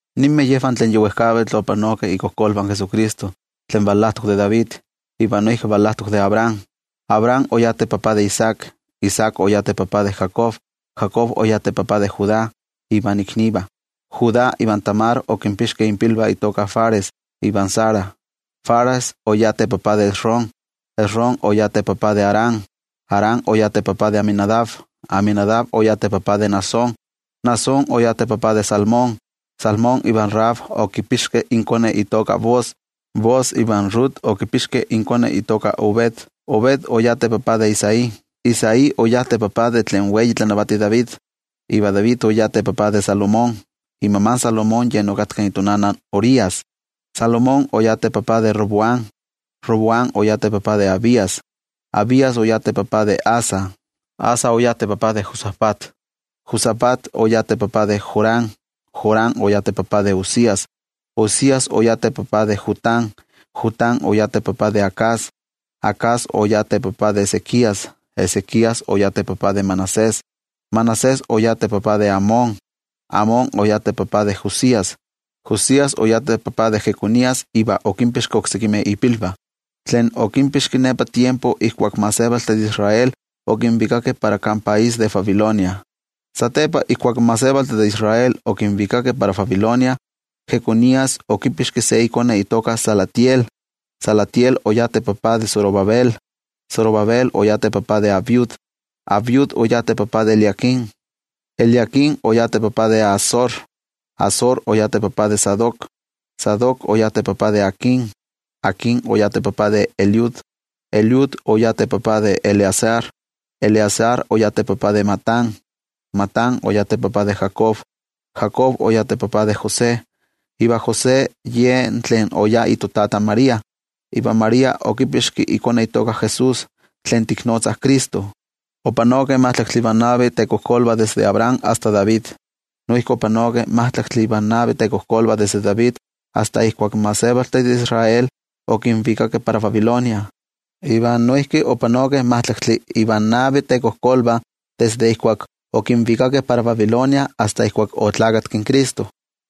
Ninmeh yejvah tlen yi wejkavitl opanokeh ikojkolvah Jesucristo, tlen valajtok de David, iva noijki valajtok de Abraham. Abraham oyá teta de Isaac. Isaac oyá teta de Jacob. Jacob oyá teta de Judá ivan iknivah. Judá ivan Tamar okinpixkeh inpilvah intoka Fares iva Zara. Fares oyá teta de Esrom. Esrom oyá teta de Aram. Aram oyá teta de Aminadab. Aminadab oyá teta de Naasón. Naasón oyá teta de Salmón. Salmón ivan Rahab okipixkeh inkone itoka Booz. Booz ivan Rut okipixkeh inkone itoka Obed. Obed oyá teta de Isaí. Isaí oyá teta de tlen wei tlanavati David, iva David oyá teta de Salomón. Imama Salomón yen okatka itonana in Urías. Salomón oyá teta de Roboam. Roboam oyá teta de Abías. Abías oyá teta de Asa. Asa oyá teta de Josafat. Josafat oyá teta de Joram. Joram oyá teta de Uzias. Uzias oyá teta de Jotám. Jotám oyá teta de Acaz. Acaz oyá teta de Ezequías. Ezequías oyá teta de Manasés. Manasés oyá teta de Amón. Amón oyá teta de Josías. Josías oyá teta de Jeconías iva okinpixki oksekimeh ipilvah, tlen okinpixki nepa tiempo ijkuak in gentejtih de Israel okinvikakeh para kan país de Babilonia. Satepa ijkuak in gentejtih de Israel okinvikakeh para Babilonia, Jeconías okipixki se ikone itoka Salatiel. Salatiel oyá teta de Zorobabel. Zorobabel oyá teta de Abiud. Abiud oyá teta de Eliaquim. Eliaquim oyá teta de Azor. Azor oyá teta de Sadoc. Sadoc oyá teta de Aquim. Aquim oyá teta de Eliud. Eliud oyá teta de Eleazar. Eleazar oyá teta de Matán. Matán oyá teta de Jacob. Jacob oyá teta de José. Iva José ye tlen oyá itotata in María. Iva María okipixki ikone itoka Jesús, tlen tiknotzah Cristo. Opanokeh majtlaktli ivan navi tekojkolvah desde Abraham asta David. Noijki opanokeh majtlaktli ivan navi tekojkolvah desde David asta ijkuak in gentejtih de Israel okinvikakeh para Babilonia. Iva noijki opanokeh majtlaktli ivan navi tekojkolvah desde ijkuak okinvikakeh para Babilonia iva asta ijkuak oneski in Cristo.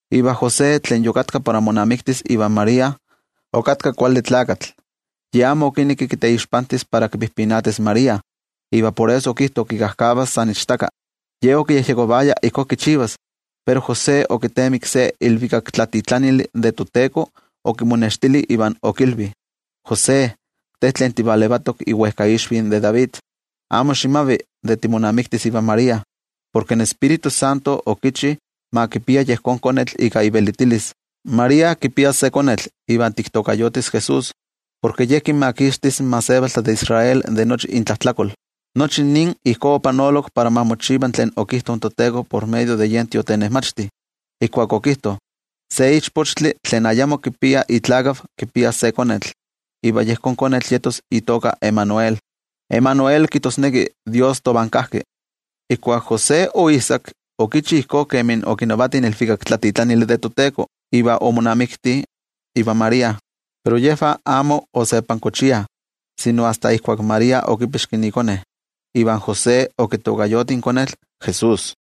Iva José, tlen yokatka para monamiktis ivan María, ye se kuali tlakatl. Ye amo okinekki kiteixpantis para kipijpinatis in María, iva por eso okijto kikajkavas san ichtaka. Ye okiyejyekovaya ijkó kichivas, pero José okitemiki se ilvikaktlatitlanili de toTeko okimonextili iva okilvi: —José, te tlen tivalevatok iwejkaixvi de David, amo ximavi de timonamiktis ivan María, porke in Tioijyotzintli ika ivelitilis okichi ma kipia yejón konetl. María kipias se konetl, iva tiktokayotis JESÚS, porke Ye kinmakixtis in gentejtih de Israel de nochi intlajtlakol. Nochi nin ijkó opanolok para ma mochiva tlen okijto in toTeko por medio de yen tiotenejmachti, ijkuak okijto: Se ichpochtli tlen ayamo kipia itotata kipias se konetl, iva yejón konetl yetos itoka Emanuel, Emanuel kijtosneki: toYejwatzi tovan kajki. Ijkuak José oijsak, okichi ijkó kemi okinavati in ilvikaktlatitlanili de toTeko, iva omonamikti ivan María. Pero yejvah amo osepankochiah sino asta ijkuak María okipixki ikone. Iva José okitokayoti in konetl Jesús.